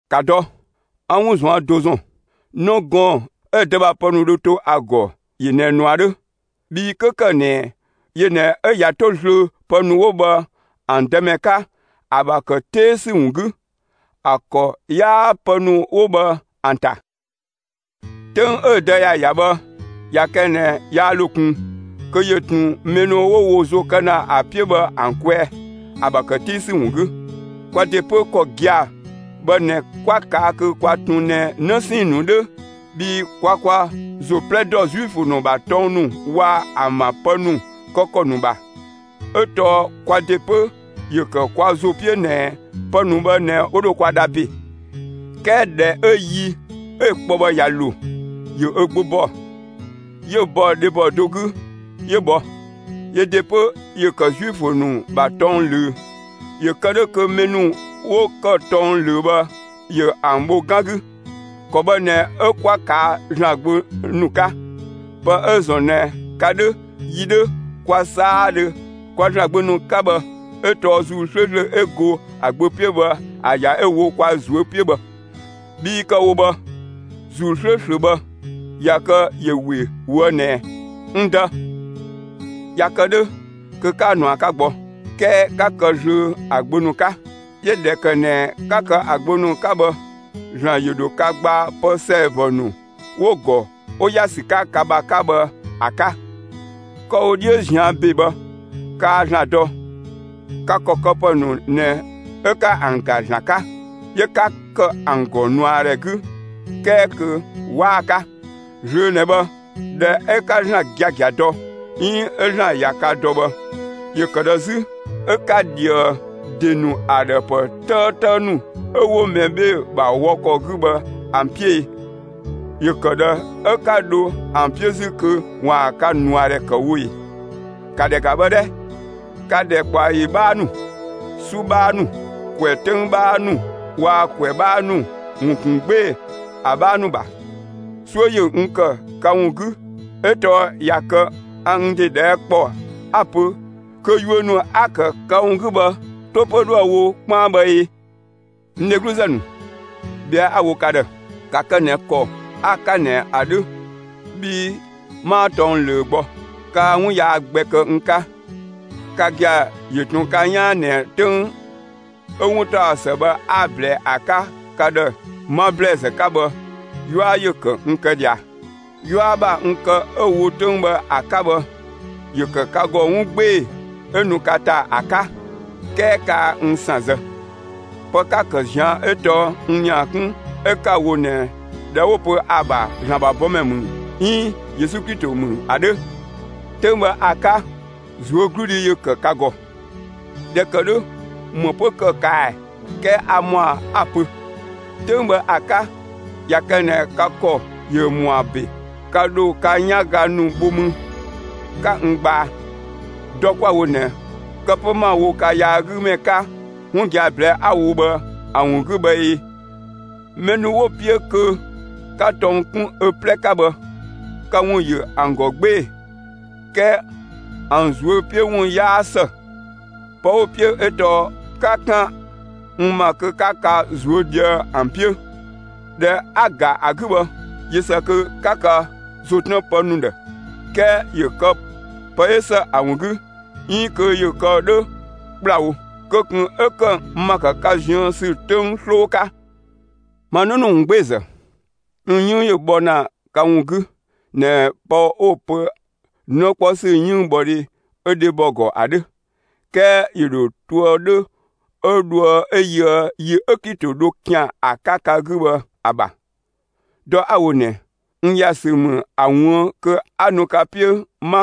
‑Ka dɔ, 'a 'wun ꞊zuan' do ‑zɔn. 'Në gɔɔn‑ 'ö‑ dë ‑bha pë ‑nu dho to ‑a ‑gɔ ‑yö ꞊nɛ ꞊nua 'dhö; bhii 'kö ‑kë ꞊nɛ yö ꞊nɛ 'ö ꞊ya 'to zlöö pë ‑nu 'wo bhë ‑an dëmɛ 'ka, ‑a ‑bha ‑kë 'tee ‑sü ‑wun 'gü, ‑a ‑kɔ 'yaa pë ‑nu 'wo bhë ‑an ‑ta. 'Töng 'ö‑ dë ‑ya ‑ya bhë, ꞊ya kë ꞊nɛ yaa ‑lo ꞊kun, kö ‑yö ꞊tun mɛ ‑nu 'wo wo ‑zo kë ‑na ‑a 'piö bhë ‑an kwɛɛ, ‑a ‑bha ‑kë 'tee ‑sü ‑wun 'gü. Kwa ‑de 'pö, ‑kɔ gia‑ bhë ꞊nɛ 'kwa ꞊kaa' kö kwa ꞊tun ꞊nɛ 'në 'sɛɛn‑ ‑nu 'dhö bhii kwa kwa ‑zo 'plɛ dɔ Zuifö ‑nu ‑bha tɔng ‑nu waa‑ ‑an ‑bha pë ‑nu kë ‑kɔ ‑nu ‑bha ('ö tɔɔ kwa ‑de 'pö ‑yö ‑kë kwa ‑zo 'piö ꞊nɛ pë ‑nu bhë ꞊nɛ 'wo dho kwa dha ‑be). 'Kɛɛ ꞊dhɛ 'ö yi 'ö‑ kpɔ bhë ꞊ya ‑lo, ‑yö ö Gbö ‑bɔ; 'yö bɔ dhebɔ do 'gü 'yö bhɔ. Yö ‑de 'pö ‑yö ‑kë Zuifö ‑nu ‑bha tɔng ꞊löö. ‑Yö kë 'dhö kö mɛ ‑nu 'wo ‑kë tɔng ꞊löö bhë ‑yö ‑an bho 'gan 'gü, ‑kɔ bhë ꞊nɛ 'ö 'kwa ꞊kaa' ‑Zlan gbö ‑nu 'ka. Pë 'ö‑ ‑zɔn ꞊nɛ ka ('dhö, yi 'dhö, kwa 'saadhö kwa) ‑Zlan gbö ‑nu 'ka bhë 'ö tɔɔ ‑Zuu 'slööslö 'ö go ‑a Gbö 'piö bhë ‑a ‑ya 'ö‑ wo kwa ꞊zuö' 'piö bhë; bhii kë‑ wo bhë, ‑Zuu 'slööslö bhë, ꞊ya kë ‑yö ‑we ꞊woë' ꞊nɛ: «N Dë!» ꞊Ya kë 'dhö, kö 'kaa ꞊nua 'ka gbɔ, 'kɛɛ 'ka kë zlöö ‑a gbö ‑nu 'ka. 'Yö ꞊dhɛ ‑kë ꞊nɛ 'ka kë ‑a gbö ‑nu 'ka bhë, ‑Zlan ‑yö ‑dho ka gbaa pë ‑sɛɛbɔ ‑nu 'wo‑ ‑gɔ 'wo ‑ya ‑sü 'ka ka ‑bha 'ka bhë ‑a 'ka. Kë‑ wo 'dhiö ꞊zian' ‑be bhë, kaa ‑Zlan dɔ; ka ‑kɔ këpë ‑nu ꞊nɛ 'ö 'ka ‑an ‑ga ‑Zlan 'ka, 'yö 'ka ‑kë ‑an ‑gɔ ꞊nuadhɛ 'gü 'kɛɛ kö 'waa‑ 'ka. Zlöö ꞊nɛ bhë, ꞊dhɛ 'ö 'ka ‑Zlan giagia dɔ, 'iin 'ö ‑Zlan ꞊ya ka dɔ bhë, ‑yö ‑kë ꞊dhë 'zü 'ö 'ka ꞊dhië ‑de nu ‑a ‑dhë ‑pë 'tëëtë ‑nu 'ö 'wo mɛ 'bhee‑ ‑bha wɔ ‑kɔ 'gü bhë ‑an 'piö e? ‑Yö ‑kë ꞊dhë 'ö 'ka dho ‑an 'piö 'zü kö ‑waan ka ꞊nuadhɛ ‑kë wo ꞊e? ‑Ka ‑dhɛ ‑ga bhë 'dhɛ! Ka ‑dhɛkpaɔyi 'bhaa ‑nu, 'su 'bhaa ‑nu, ‑kwɛ 'töng 'bhaa ‑nu waa‑ ‑kwɛ 'bhaa ‑nu ‑wun ‑kun 'gbee‑ ‑a 'bhaa ‑nu ‑bha. 'Suö ‑yö n ‑kë ka ‑wun 'gü 'ö tɔɔ ꞊ya kë a n ‑de ꞊dhɛɛ' kpɔ 'a‑ pö kö yuö ‑nu 'a‑ ‑kë ka ‑wun 'gü bhë 'to 'pö 'dhoë‑ wo 'kpaan bhë ꞊e? N dhegluzë ‑nu, ꞊bhɛa'‑ 'a‑ wo ka ‑dhë; ‑ka kë ꞊nɛ ‑kɔ 'a‑ 'ka ꞊nɛ ‑a 'dhö bhii 'maa tɔng ꞊löö gbɔ. Kaa 'wun yaa gbɛ kë n 'ka. Ka gia‑ ‑yö ꞊tun ka 'yaan ꞊nɛ 'töng 'ö 'wuntaɔsë bhë 'a‑ ꞊blɛɛ ‑a 'ka ka ‑dhë 'ma ‑blɛɛzë 'ka bhë, 'yua ‑yö ‑kë n kë ꞊dhia. 'Yua ‑bha n kë 'ö‑ wo 'töng bhë ‑a 'ka bhë, ‑yö ‑kë ka ‑gɔ 'wun 'gbee‑ 'ö nu ka ‑ta ‑a 'ka, 'kɛɛ kaa n ‑san zë. Pë 'ka‑ ‑kë ꞊zian' 'ö tɔɔ n ‑nia 'kun 'ö 'ka‑ wo ꞊nɛ ꞊dhɛ 'wo‑ pö ‑a ‑bha ‑Zlan ‑bha bɔmɛ ‑mü 'iin Yesu Klito ‑mü ‑a 'dhö. 'Töng bhë ‑a 'ka, ꞊zuögludhi ‑yö ‑kë ka ‑gɔ. ꞊Dhɛ ‑kë 'dhö, ‑më 'pö ‑kë kaa ꞊ɛ? 'Kɛɛ a ‑mɔa 'a‑ pö: 'Töng bhë ‑a 'ka, ꞊ya kë ꞊nɛ ka ‑kɔ ‑yö ‑mɔa ‑be, ka ‑dho ka 'yanga ‑nu bho mü 'ka n gbaa. Dɔ 'kwa‑ wo ꞊nɛ, kë 'pö 'ma‑ wo ka yaagümɛ 'ka 'wun gia‑ ꞊blɛɛ'‑ 'a‑ wo bhë ‑a ‑wun 'gü bhë ee? Mɛ ‑nu 'wo‑ 'piö kö 'ka tɔng 'kun ö 'plɛ 'ka bhë, ka ‑wun ‑yö ‑an ‑gɔ 'gbee‑; 'kɛɛ ‑an ꞊zuö' 'piö ‑wun 'yaa ‑së. Pë 'wo‑ 'piö 'ö tɔɔ 'ka 'kan n ‑ma kö 'ka ka ꞊zuö' ꞊dhië'‑ ‑an 'piö. ꞊Dhɛ 'a‑ ‑ga ‑a 'gü bhë, ꞊yö ‑së kö 'ka ka ‑zo 'tën pë ‑nu ‑dhë, 'kɛɛ ‑yö kë pë 'ö ‑së ‑a ‑wun 'gü 'iin kö ‑yö kë 'dhö ‑kplawo; kö ꞊kun 'ö ‑kë n ‑ma ‑kë ka ziën ‑sü 'töng 'sloo 'ka. Ma 'në ‑nu ‑wungbeezë, n 'yënng ‑yö bhɔ ‑na ka ‑wun 'gü ꞊nɛ pë 'wo‑ pö 'në 'kpɔ ‑sü 'yënngbhɔdhe 'ö dhebɔ ‑gɔ ‑a 'dhö; 'kɛɛ ‑yö ‑dho toë 'dhö 'ö dhoë 'ö yöë yi 'ö Klito dho ‑kian ‑a 'ka ka 'gü bhë ‑a ‑bha. Dɔ 'a‑ wo ꞊nɛ, n ‑ya ‑sü ‑mü ‑a ꞊wuën' kö 'a nu ka 'piö 'ma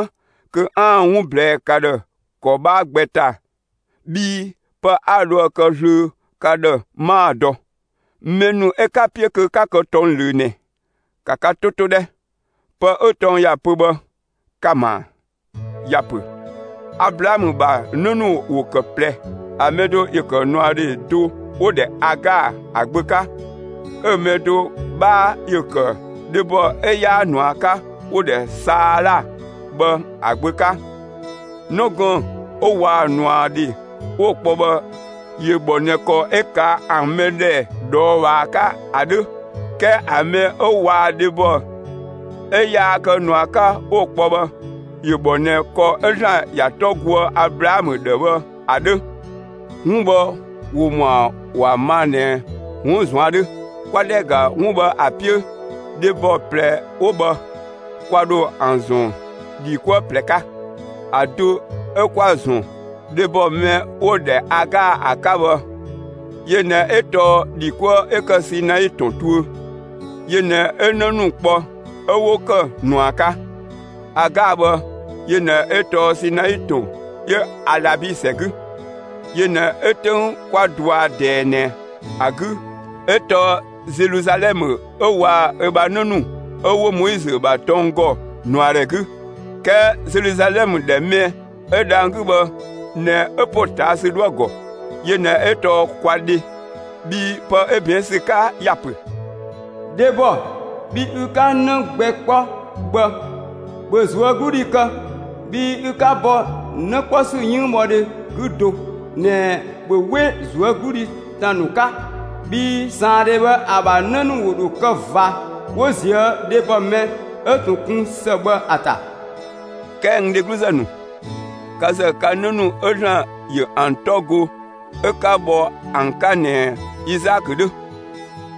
kö 'aan‑ 'wun ꞊blɛɛ'‑ ka ‑dhë ‑kɔ 'bhaa gbɛ ‑ta bhii pë 'a dhoë‑ kë zlöö ka ‑dhë 'maa‑ dɔ. Mɛ ‑nu 'ö 'ka‑ 'piö kö 'ka kë tɔng ꞊löö ꞊nɛ, ‑ka ka 'to 'to 'dhɛ! Pë 'ö tɔng ‑ya pö bhë, ka‑ ‑ma ‑a? ‑Ya ‑pö Ablaamö ‑bha 'në ‑nu ‑wo ‑kë ꞊plɛ. ‑A mɛ do ‑yö ‑kë ꞊nuadhe do ('wo‑ ‑dhɛ Agaa), ‑a gbö 'ka, 'ö‑ mɛ do 'bhaa ‑yö ‑kë dhebɔ 'ö 'yaa ꞊nua 'ka ('wo‑ ‑dhɛ Saala bhë), ‑a gbö 'ka. 'Në gɔɔn‑ 'ö waa‑ ꞊nuadhe 'wo‑ kpɔ bhë ‑yö ‑bhɔ ꞊nɛ ‑kɔ 'ö ꞊kaa' ‑an mɛdhɛ ꞊dhɔɔbhaa 'ka ‑a 'dhö; 'kɛɛ ‑a mɛ 'ö waa‑ dhebɔ 'ö yaa kë ꞊nua 'ka 'wo‑ kpɔ bhë, ‑yö ‑bhɔ ꞊nɛ ‑kɔ 'ö ‑Zlan ‑ya 'tɔ goë Ablaamö ‑dhë bhë ‑a 'dhö. 'Wun bhë ‑wo ‑mɔa ‑wa ma ꞊nɛ 'wun ꞊zuan' 'dhö. 'Kwa ‑dhɛ ‑ga 'wun bhë ‑a 'piö, dhebɔ ꞊plɛ 'wo bhë, kwa ‑dho ‑an ‑zɔn ‑dhi 'kuë ꞊plɛ 'ka. ‑A do 'ö 'kwa‑ ‑zɔn dhebɔ mɛ 'wo‑ ‑dhɛ Agaa ‑a 'ka bhë, yö ꞊nɛ 'ö tɔɔ ‑dhi 'kuë 'ö ‑kë Sinai ‑tɔn tuö. Yö ꞊nɛ 'ö 'në ‑nu kpɔ 'ö 'wo ‑kë ꞊nua 'ka. Agaa bhë, yö ꞊nɛ 'ö tɔɔ Sinai ‑tɔn 'ö Alabi ‑sɛ 'gü; yö ꞊nɛ 'ö 'töng 'kwa dɔa ꞊dɛɛ ꞊nɛ ‑a 'gü 'ö tɔɔ Zeluzalɛmë 'ö waa‑ ö ‑bha 'në ‑nu 'ö 'wo (Moizö ‑bha tɔng ‑gɔ) ꞊nuadhɛ 'gü. 'Kɛɛ Zeluzalɛmë ‑dhɛ mɛ 'ö dhang‑ 'gü bhë ꞊nɛ 'ö ‑potaasü 'dhoë‑ ‑gɔ. Yö ꞊nɛ 'ö tɔɔ kwa dhe. Bhii pë 'ö ꞊bɛɛn' ‑sü 'ka ‑ya ‑pö: Dhebɔ, bhi ü 'ka 'në gbɛ 'kpɔ bhë, ‑bhö ꞊zuögludhi kë; bhi ü 'ka bɔ 'në 'kpɔ ‑sü 'yënngbhɔdhe 'gü do ꞊nɛ, ‑bhö 'we ꞊zuögludhi ‑tan ‑nu 'ka! Bhii ꞊saandhe bhë ‑a ‑bha 'në ‑nu ‑wo ‑dho kë ꞊va 'wo ꞊zië' dhebɔ mɛ 'ö ꞊tun kun ‑së bhë ‑a ‑ta. 'Kɛɛ n dhegluzë ‑nu, ka ‑zë ka 'në ‑nu 'ö ‑Zlan ‑yö ‑an 'tɔ go 'ö 'ka bhɔ ‑an 'ka ꞊nɛ Izaakö 'dhö.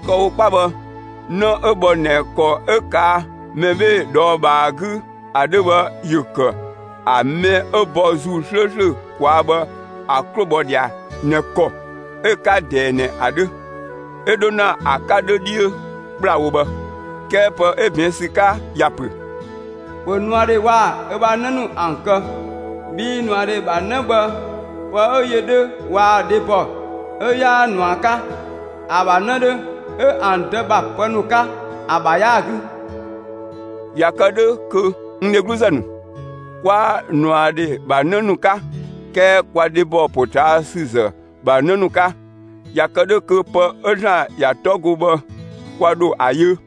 Kë‑ wo 'kpa bhë, 'në 'ö bhɔ ꞊nɛ ‑kɔ 'ö ꞊kaa' mɛ 'bhee‑ ꞊dhɔɔbhaa 'gü ‑a 'dhö bhë ‑yö ‑kë ‑a mɛ 'ö bhɔ ‑Zuu 'slööslö ꞊kwaa' bhë ‑a 'klo bhɔ ꞊dhia ꞊nɛ ‑kɔ 'ö‑ 'ka ꞊dɛɛ ꞊nɛ ‑a 'dhö; 'ö 'dho ‑na ‑a 'ka 'dhö 'dhiö ‑kplawo bhë. 'Kɛɛ pë 'ö ꞊bɛɛn' ‑sü 'ka ‑ya ‑pö: ‑Bhö ꞊nuadhe waa‑ ö ‑bha 'në ‑an kë; bhii ꞊nuadhe ‑bha 'në bhë, pë 'ö yö 'dhö waa‑ dhebɔ 'ö 'yaa ꞊nua 'ka, ‑a ‑bha 'në 'dhö 'ö ‑an dë ‑bha pë ‑nu 'ka, ‑a ‑bha 'yaa‑ 'gü. ꞊Ya kë 'dhö kö, n dhegluzë ‑nu, 'kwaa ꞊nuadhe ‑bha 'në ‑nu 'ka, 'kɛɛ kwa dhebɔ ‑potaasüzë ‑bha 'në ‑nu 'ka. (꞊Ya kë 'dhö kö pë 'ö ‑Zlan ‑ya 'tɔ go bhë, kwa ‑dho ‑a yö.)